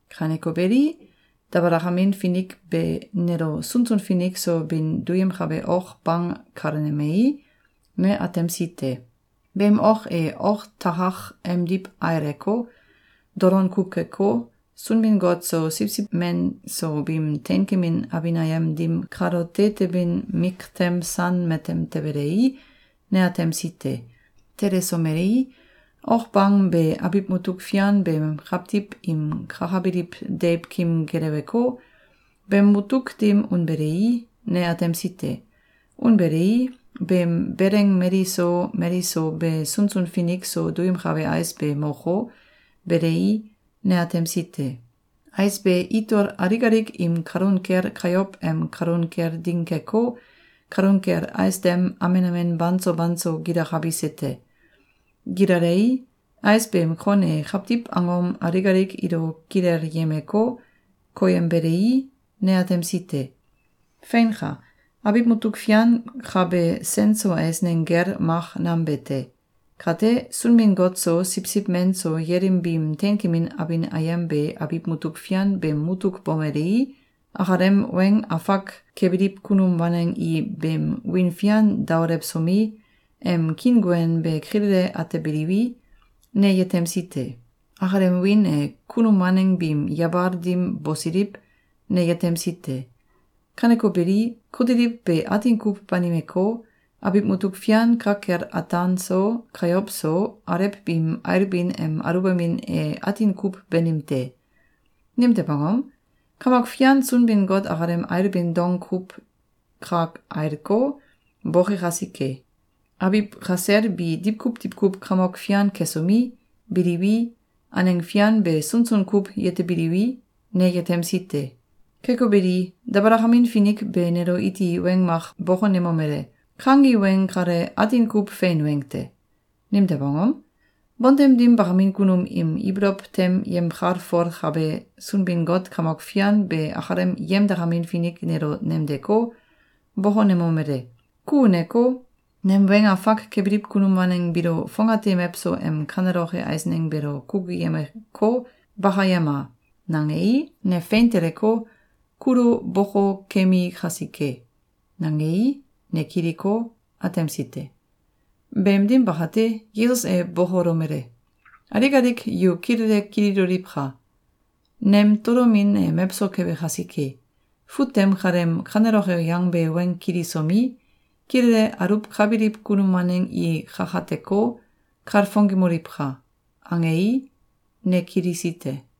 Kaneko beli, dabalakamin finik be nelo sunsun finik so bin duyemkabe ok bang kalenemei, ne atemsi te. Beem ok e oktakak emdiw aileko, dolon kuw keko, Sunbin-Got so Siwsiw Men so biim teinkemin abin ayem dim kalote tebin miktem san matem tebelei, ne atemsi te. Telesomelei, ok bang be abiw mutuk fian beem kawtiw im kakabiliw deiwkim geleweko, beem mutuk dim unbelei, ne atemsi te. Unbelei, beem beleng mali so mali so be sunsun finik so duyemkabe ais be moko, belei, ne atemsi te. Ais be itol alik alik im kalun kel kayow em kalun kel ding keko, kalun kel ais dem amen amen banso banso gilakabise te. Gilalei, ais beem kon e kawtiw angom alik alik ilo kilelyemeko, koyembelei, ne atemsi te. Feinka! Abiw mutuk fian ka be sen so eisneng gel mak nam be te. Kate, Sunbin-Got so Siwsiw Men so yelim biim teinkemin abin ayem be abiw mutuk fian beem mutuk bomelei, akalem weng afak kebiliw kunum waneng i beem wiin fian daolewsomi, em kiinguen be kilele atebiliwi, ne yetemsi te. Akalem wiin e kunum waneng biim yabal dim bosiliw, ne yetemsi te. Kaneko beli, kutiliw be atin kuw banimeko, abiw mutuk fian ka kel ataan so, kayow so, alew biim ailbin em aluwbamin e atin kuw banim te. Nimtew angom? Kamok Fian Sunbin-Got akalem ailbin dong kuw ka ailko, boke kasike. Abiw kasel bi diwkuw diwkuw kamok fian kesomi, biliwi, aneng fian be sunsun kuw yetebiliwi, ne yetemsi te. Keko beli, dabalakamin finik be nelo iti weng mak bokonemomele: “Kangi weng kale atin kuw fein weng te. Nimtew angom? Bontem dim bakamin kunum im ibolow tem yemkalfolkabe Sunbin-Got Kamok Fian be akalem yemdakamin finik nelo nemdeko, bokonemomele: ‘Ku uneko, nem weng afak kebiliw kunum waneng biilo fongate mewso em kaneloke eisneng beelo kukuyemeko, bakayema!’, nangei, ne fein teleko, kulo bokokemi kasike.”, nangei, ne kiliko, atemsi te. Beem dim bakate, Yesus e bokolomele: “Alik alik yu kilele kililoliwka! Nem tolomin e mewso kebe kasike. Fut tem kaleem kaneloke yangbe weng kilisomi, kilele aluwkabiliw kunum waneng i kakateko, kalfongemoliwka!”, angei, ne kilisi te.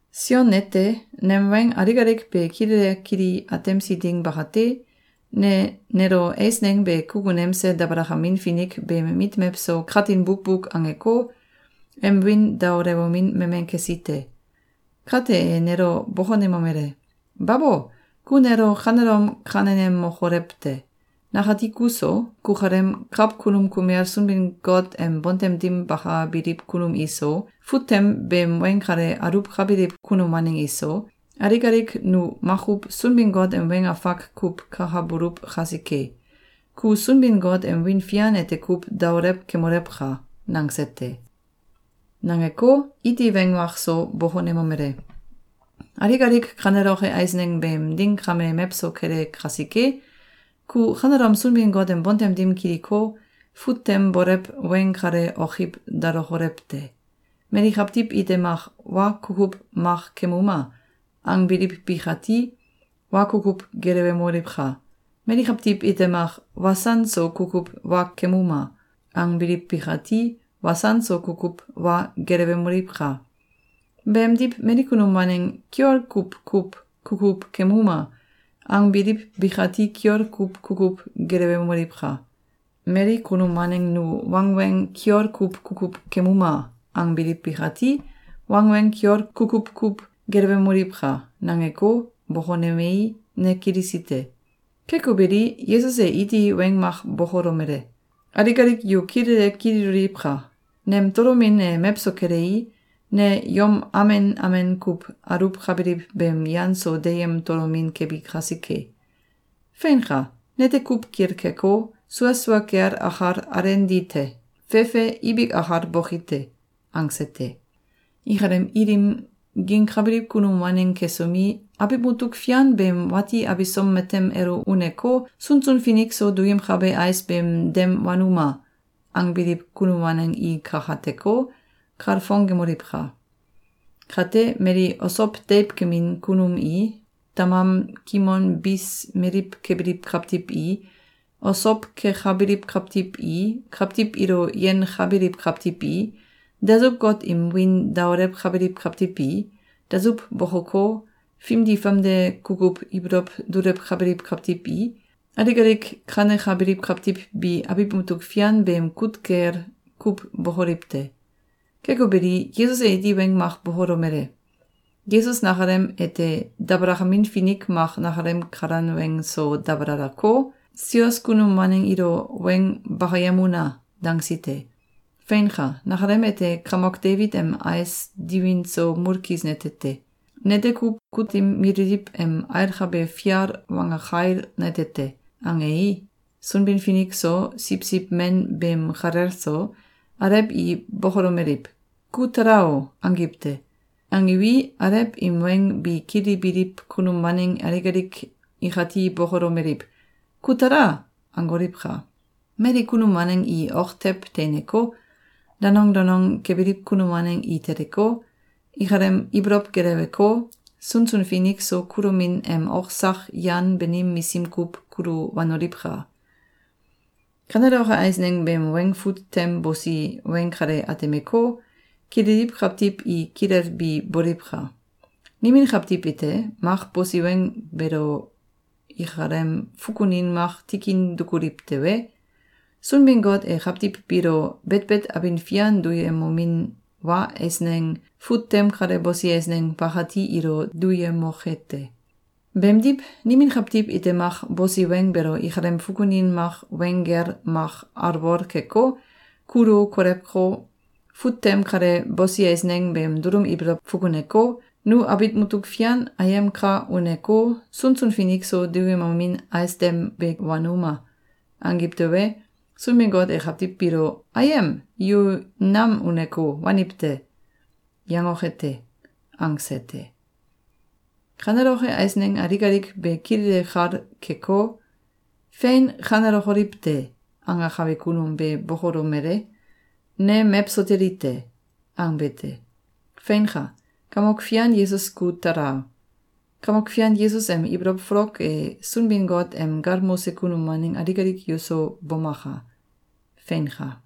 Sion nete, nem weng alik alik be kilele kili atemsi ding bakate, ne nelo eisneng be kukunemse dabalakamin finik beem mit mewso katin bukbuk angeko, em wiin daolewomin memen kesi te. Kate e nelo bokonemomele: “Babo! Ku nelo kanelom kanenemokolew te! Nakati kuso, kukalem kawkunum kumel Sunbin-Got em bontem dim bakabiliw kunum iso, fut tem beem weng kale aluwkabiliw kunum waneng iso, alik alik nu makuw Sunbin-Got em weng afak kuw kakabuluw kasike. Ku Sunbin-Got em wiin fian ete kuw daolew kemolewka!”, nangse te. Nangeko, iti weng mak so bokonemomele: “Alik alik kaneloke eisneng beem ding kame mewso kele kasike, ku kanelom Sunbin-Got em bontem dim kiliko, fut tem bolew weng kale okiw dalokolew te! Mali kawtiw ite mak ‘Wa kukuw mak kemuma!’, angbiliw bikati, wa kukuw gelewemoliwka! Mali kawtiw ite mak ‘Wasan so kukuw wa kemuma!’, angbiliw bikati, wasan so kukuw wa gelewemoliwka! Beemdiw mali kunum waneng ‘Kiol kuw kuw kukuw kemuma!’, angbiliw bikati kiol kuw kukuw gelewemoliwka! Mali kunum waneng ‘Nu wangweng kiol kuw kukuw kemuma!’, angbiliw bikati, wangweng kiol kukuw kuw gelewemoliwka!”, nangeko, bokonemei, ne kilisi te. Keko beli, Yesus e iti weng mak bokolomele: “Alik alik yu kilele kililoliwka! Nem tolomin e mewso kelei, ne yom amen amen kuw aluwkabiliw beem yan so deyem tolomin kebi kasike. Feinka! Nete kuw kilkeko, sua sua kel akal alenali te. Fefe ibik akal boki te.”, angse te. Ikalem ilim gingkabiliw kunum waneng kesomi, “Abiw mutuk fian beem wati abisom matem elo uneko, sunsun finik so duyemkabe ais beem dem wanuma!”, angbiliw kunum waneng i kakateko, kalfongemoliwka! Kate, mali osow deiwkim kunum i, tamam kimon bis meliw kebiliw kawtiw i, osow kekabiliw kawtiw i, kawtiw ilo yenkabiliw kawtiw i, dasuw-got im wiin daolewkabiliw kawtiw i, dasuw bokoko, fimdi famde kukuw ibolow dulewkabiliw kawtiw i, alik alik kanekabiliw kawtiw bi abiw mutuk fian beem kut kel kuw bokoliw te. Keko beli, Yesus e iti weng mak bokolomele: “Yesus nakalem ete dabalakamin finik mak nakalem kalan weng so dabalaleko, ‘Sios kunum waneng ilo weng bakayem una!’, dangsi te. Feinka! Nakalem ete kamok Debit em ais diwin so mulkis nete te. Nete kuw kutim mililiw em ailkabe fial wanggakail nete te.”, angei, Sunbin-Finik so, Siwsiw Men beem kalel so, alew i bokolomeliw: “Ku tala o!”, angiw te. Angiwi, alew im weng be kilibiliw kunum waneng alik alik ikati bokolomeliw: “Ku tala!”, angoliwka! Mali kunum waneng i ok tew teineko, danong danong kebiliw kunum waneng i teleko, ikalem ibolow geleweko, sunsun finik so kulomin em ok sak yan banim misim kuw kulu wanoliwka! Kaneloke eisneng beem weng fut tem bosi weng kale atemeko, kililiw kawtiw i kilelbi boliwka! Nimin kawtiw ite mak bosi weng beelo ikalem fukunin mak tikin dukuliw tewe, Sunbin-Got e kawtiw biilo betbet abin fian duyemomin wa eisneng fut tem kale bosi eisneng bakati ilo duyemoke te. Beemdiw, nimin kawtiw ite mak bosi weng beelo ikalem fukunin mak weng gel mak alwol keko, kulu kolewko, fut tem kale bosi eisneng beem dulum ibolow fukuneko, ‘Nu abiw mutuk fian ayem ka uneko, sunsun finik so duyemomin ais dem be wanuma!’, angiw tewe, Sunbin-Got e kawtiw biilo ‘Ayem! Yu nam uneko, waniw te!’, yangoke te.”, angse te. Kaneloke eisneng alik alik be kilele kal keko, “Fein kanelokoliw te!”, angakabe kunum be bokolomele: “Ne mewso teli te!”, angbe te. Feinka! Kamok Fian Yesus ku tala! Kamok Fian Yesus em ibolow folok e Sunbin-Got em galmose kunum waneng alik alik yuso bomaka! Feinka!